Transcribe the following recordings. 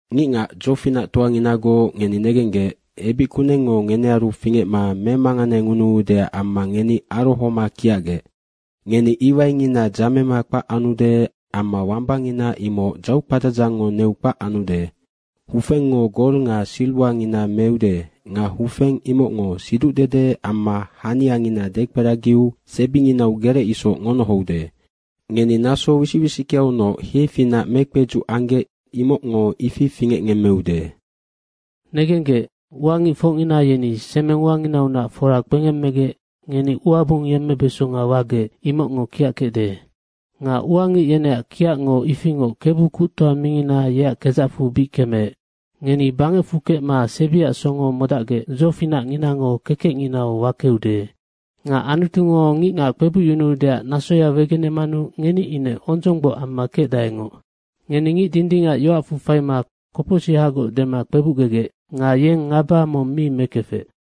Ngicngac dzofinactoanginagoc, ngeni negenggec, ebic kunengngo ngenearu fingecma memanganengunuudeac amma ngeni arohoma kiacgec. Ngeni iwaingina dzamema kpac anude amma wambangina imoc dzaukpadzadzangngo neu kpac anude. Hufengngo gol nga siriwangina meude nga hufeng imocngo siducdede amma haniangina dekperagiu sebinginau gerec isoc ngonohoude. Ngeni naso wisic wisickeaunoc hiefinac mekpedzuc anggec, imocngo ifi fingecngemmeude. Negenggec, ua ngicfocngina yeni semeng uanginaunac fora kpengemmegec ngeni ua bung yemmebeso wagec, imocngo kiackecde. Nga ua ngic yeneac kiacngo ifingoc Kebu Kuctoa mingina yeac kedzacfu bic kemeec. Ngeni bangecfu kecma sebiac songo modacgec dzofinacnginango kekecnginau wakeude. Nga Anutungo ngicngac kpebucyunuudeac nasoya wegenemanu ngeni ine ondzonggboc amma kecdaengoc. Ngeni ngic dindingac yoacfu faima kopocsihagoc dema kpebucgegec nga yeng ngaba mong mi mekefec.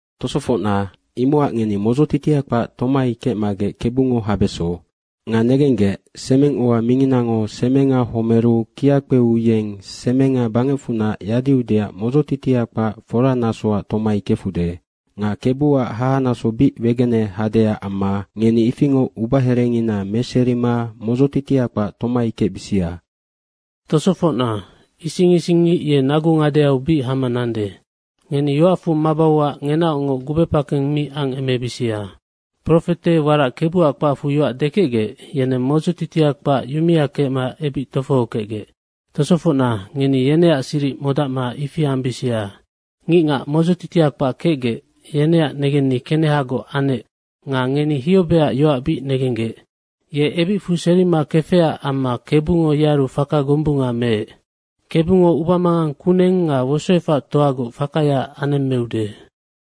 Tosofocna, imocac ngeni modzotitia kpac tomai kecmagec Kebungo habeso. Nga negenggec, semeng ua minginango semenga homeru kia kpeu yeng semenga bangecfunac yadiudeac modzotitia kpac fora nasoac tomai kefude. Nga Kebuac hahanaso bic wegene hadeac amma ngeni ifingoc ubaherengina meserima modzotitia kpac tomai kecbisia. Tosofocna, ising isingngic ye nagu ngadeau bic hama nande. Ngeni yoacfu mabauac ngenaocngoc gubepakeng mi angemebisia. Profete warac Kebuac kpacfu yoac dekecgec, yeneng modzotitia kpac yumea kecma ebic tofohokecgec. Tosofocna, ngeni yeneac siric modacma ifi ambisia. Ngicngac modzotitia kpac kecgec, yeneac negenni kenehagoc anec nga ngeni Hiobeac yoac bic negenggec. Ye ebicfu serima kefecac amma Kebungo yearu faka gombunga meec. Kebungo ubamangang kuneng nga wosoefactoagoc fakaya anemmeude.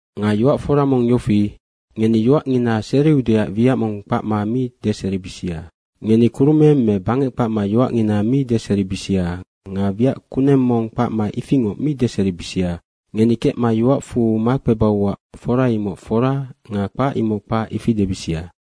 Nga yoac fora mong yofi, ngeni yoacngina seriudeac wiac mong kpacma mi deseribisia. Ngeni kurumeng me bangec kpacma yoacngina mi deseribisia nga wiac kuneng mong kpacma ifingoc mi deseribisia. Ngeni kecma yoacfu makpebauac fora imoc fora nga kpac imoc kpac, ifi debisia.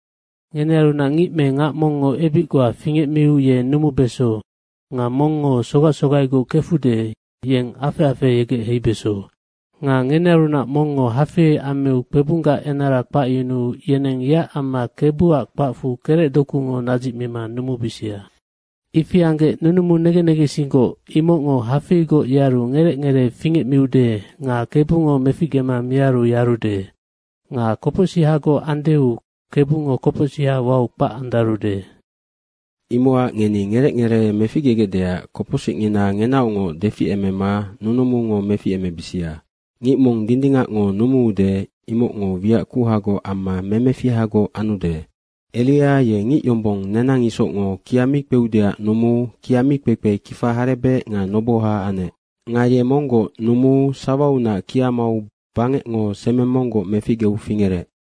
Ngenearunac ngic me ngac mongngo ebic goa fingecmiu ye numubeso nga mongngo sogac sogaigoc kefude, yeng afec afeheyegec heibeso. Nga ngenearunac mongngo hafei ammiu kpebunggac enara kpacyunuu yeneng yeac amma Kebuac kpacfu kerecdokungo nadzicmima numubisia. Ifi anggec nunumu negen negensinggoc, imocngo hafeigoc yearu ngerec ngeree fingecmiude nga Kebungo meficgema miaru yarude. Nga kopocsihagoc andeu Kebungo kopocsiha wau kpac andarude. Imocac ngeni ngerec ngeree meficgegecdeac kopocsicngina ngenaocngoc deficemema nunumungo meficemebisia. Ngic mong dindingacngo numuude imocngo wiac kuhagoc amma memefihagoc anude. Eria ye ngic yombong nenang isocngo kia mi kpeudeac numuu kia mi kpekpe kifa harebec nga noboha anec. Nga ye monggoc numuu sawaunac kia mau bangecngo semeng monggoc meficgeu fingerec.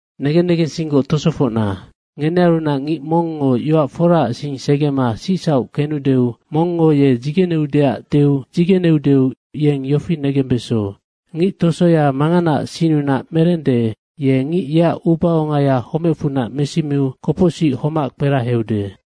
Negen negensinggoc tosofocna, ngenearunac ngic mongngo yoac foraac sing segema sicsauc kenudeu mongngo ye dzigeneudeac deu dzigeneudeu yeng yofi negembeso, ngic tosoya manganaac sinnunac merende, ye ngic yeac ubaongaya homecfunac mesimiu kopocsic homac kperaheude.